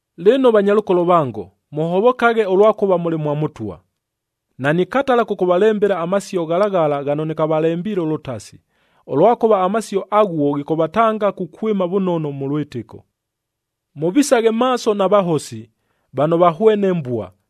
Lɨno, vanyalʉkolo vango, mʉhovokaghe ʉlwakʉva mʉlɨ mwa Mʉtwa! Nanikatala kʉkʉvalembela amasio ghala ghala ghano nɨkavalembiile ʉlʉtasi, ʉlwakʉva amasio aghuo ghikʉvatanga kukwɨma vʉnono mʉ lwɨtɨko. Mʉvisaghe maaso na vahosi, vano vahwene mbua,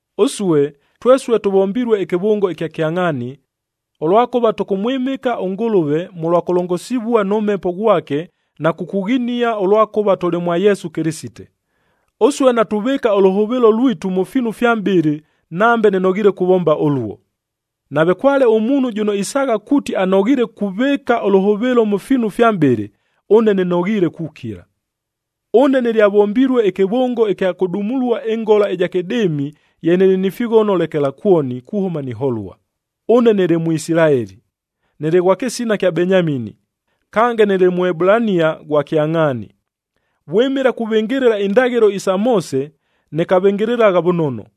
Ʉsue, twesue tʉvombilue ɨkɨvʉngo ɨkya kyangʼhaani, ʉlwakʉva tʉkʉmwɨmɨka ʉNgʉlʉve mʉlwa kʉlongosivua nʉ Mhepo ghwake na kukughinia ʉlwakʉva tʉlɨ mwa Yesu Kɨlɨsite. Ʉsue natuvɨɨka ʉlʉhʉvɨɨlo lwitu mʉ fiinu fya mʼbɨlɨ, nambe nɨnoghiile kuvomba ʉluo! Nave kwale ʉmuunhu jʉno isaagha kuuti anoghiile kuvɨɨka ʉlʉhʉvɨɨlo mʉ fiinu fya mʼbɨlɨ, ʉne nɨnoghiile kukila. Ʉne nɨlyavombilue ɨkɨvʉngo ɨkya kʉdumulua ɨngola ɨja kɨdɨɨmi ye nɨlɨ ni fighono lekelakwoni kuhʉma niholua, ʉne nɨlɨ Mʉisilaeli, nɨlɨ ghwa kɨsina ɨkya Benyamini, kange nɨlɨ Mʉebulania ghwa kyangʼhaani. Vwɨmɨla kuvɨngɨlɨla indaghɨlo isa Moose, nɨkavɨngɨlɨlagha vʉnono,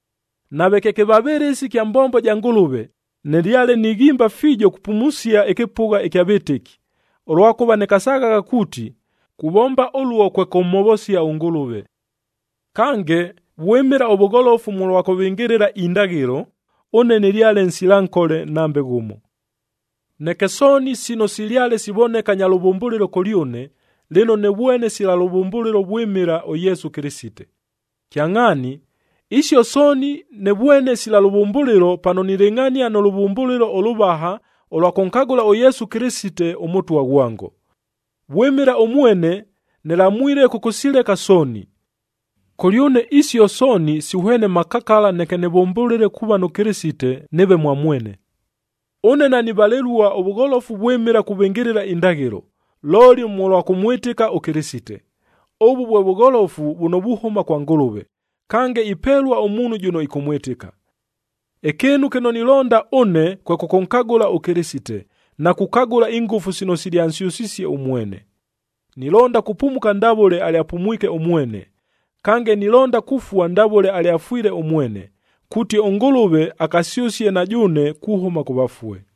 Nave kye kɨvavɨlɨsi kya mbombo ja Ngʉlʉve, nɨlyale nighimba fiijo kupumusia ɨkɨpʉgha ɨkya vɨtɨki, ʉlwakʉva nɨkasaghagha kuuti, kuvomba ʉluo kwe kʉmhovosia ʉNgʉlʉve. Kange, vwɨmɨla ʉvʉgholofu mʉlwa kʉvɨngɨlɨla indaghɨlo, ʉne nɨlyale nsila nkole nambe ghʉmo. Neke sooni sino silyale sivoneka nya lʉvʉmbʉlɨlo kʉlyʉne, lɨno nɨvwene sila lʉvʉmbʉlɨlo vwɨmɨla ʉYesu Kɨlɨsite. Kyangʼhaani, isio sooni nɨvwene sila lʉvʉmbʉlɨlo pano nilɨngʼhania nʉ lʉvʉmbʉlɨlo ʉlʉvaha ʉlwa kʉnkagʉla ʉYesu Kɨlɨsite, ʉMʉtwa ghwango. Vwɨmɨla ʉmwene, nɨlamwile kʉkʉsileka sooni. Kʉlyʉne isio sooni sihwene makakala neke nɨvʉmbʉlɨle kuuva nʉ Kɨlɨsite, nɨɨve mwa mwene. Ʉne nanivalɨlua ʉvʉgholofu vwɨmɨla kuvɨngɨlɨla indaghɨlo, looli mʉlwa kʉmwɨtɨka ʉKɨlɨsite. Ʉvʉ vwe vʉgholofu vʉno vuhʉma kwa Ngʉlʉve, kange ipelua ʉmuunhu jʉno ɨkʉmwɨtɨka. Ɨkɨɨnu kɨno nilonda ʉne kwe kʉkʉnkagʉla ʉKɨlɨsite, na kukagʉla ingʉfu sino silyansyʉsisie ʉmwene. Nilonda kupumuka ndavʉle alyapumwike ʉmwene, kange nilonda kufua ndavʉle alyafwile ʉmwene, kuuti ʉNgʉlʉve akasyʉsie na jʉʉne kuhʉma kʉ vafue.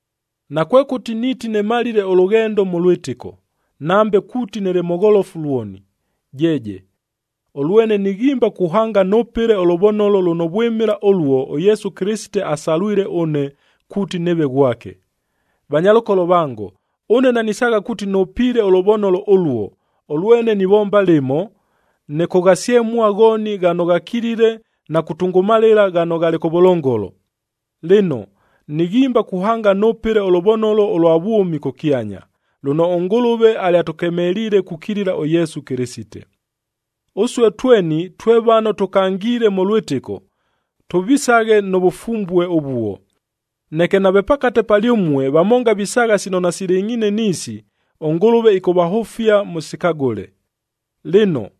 Nakwekʉti niiti nɨmalile ʉlʉghendo mʉ lwɨtɨko, nambe kuuti nɨlɨ mʉgholofu lwoni, jeeje! Ʉlwene nighimba kuhanga nʉpɨle ʉlʉvonolo lʉno vwɨmɨla ʉluo ʉYesu Kɨlɨsite asalwile ʉne kuuti nɨɨve ghwake. Vanyalʉkolo vango, ʉne nanisaagha kuuti nʉpiile ʉlʉvonolo ʉluo, ʉlwene nivomba lɨmo, nɨkʉghasyemua ghooni ghano ghakilile na kutʉngʉmalɨla ghano ghalɨ kʉvʉlongolo. Lɨno, nighimba kuhanga nʉpɨle ʉlʉvonolo ʉlwa vwʉmi kʉkyanya, lʉno ʉNgʉlʉve alyatʉkemeliile kukilila ʉYesu Kɨlɨsite. Ʉsue tweni twe vano tʉkangiile mʉ lwɨtɨko, tʉvisaghe nʉ vʉfumbue ʉvuo. Neke nave pakate palyʉmue vamonga visaagha sino nasilɨngʼhiine niisi, ʉNgʉlʉve ɨkʉvahʉfia mʉsikagʉle. Lɨno,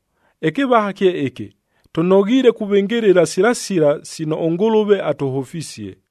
ɨkɨvaha kye ɨkɨ, tʉnoghiile kuvɨngɨlɨla sila sila sino ʉNgʉlʉve atʉhʉfisie.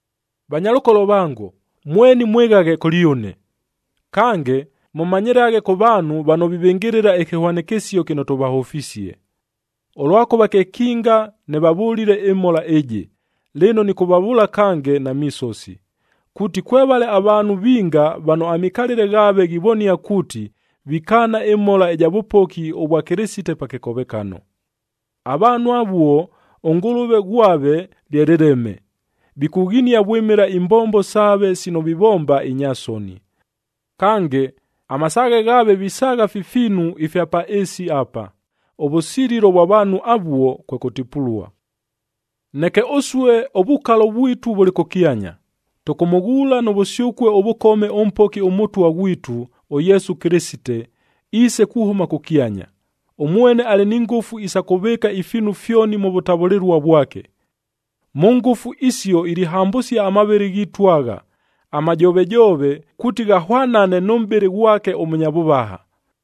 Vanyalʉkolo vango, mweni mwɨghaghe kʉlyʉne. Kange, mʉmanyɨlaghe kʉ vaanhu vano vivɨngɨlɨla ɨkɨhwanɨkɨsio kɨno tʉvahʉfisie. Ʉlwakʉva kekinga nɨvavʉlile ɨmhola ɨjɨ, lɨno nɨkʉvavʉʉla kange na misosi, kuuti kwevale avaanhu vinga vano amikalɨle ghaave ghivonia kuuti, vikaana ɨmhola ɨja vʉpoki ʉvwa Kɨlɨsite pa kɨkovekano. Avaanhu avuo ʉngʉlʉve ghwave lye lɨleme, vikughinia vwɨmɨla imbombo saave sino vivomba inya soni. Kange, amasaaghe ghaave visaagha fi fiinu ifya pa ɨɨsi apa. Ʉvʉsililo vwa vaanhu avuo, kwe kʉtipulua. Neke ʉsue ʉvukalo vwitu vʉlɨ kʉkyanya, tʉkʉmʉghuula nʉ vʉsyʉkue ʉvʉkome ʉMpoki ʉMʉtwa ghwitu, ʉYesu Kɨlɨsite, iise kuhʉma kʉkyanya. Ʉmwene alɨ ni ngʉfu isa kʉvɨɨka ifiinu fyoni mʉ vʉtavʉlɨlua vwake. Mʉ ngʉfu isio ilihambʉsia amavɨlɨ ghiitu agha, amajovejoove kuuti ghahwanane nʉ mʼbɨlɨ ghwake ʉmʉnya vʉvaha.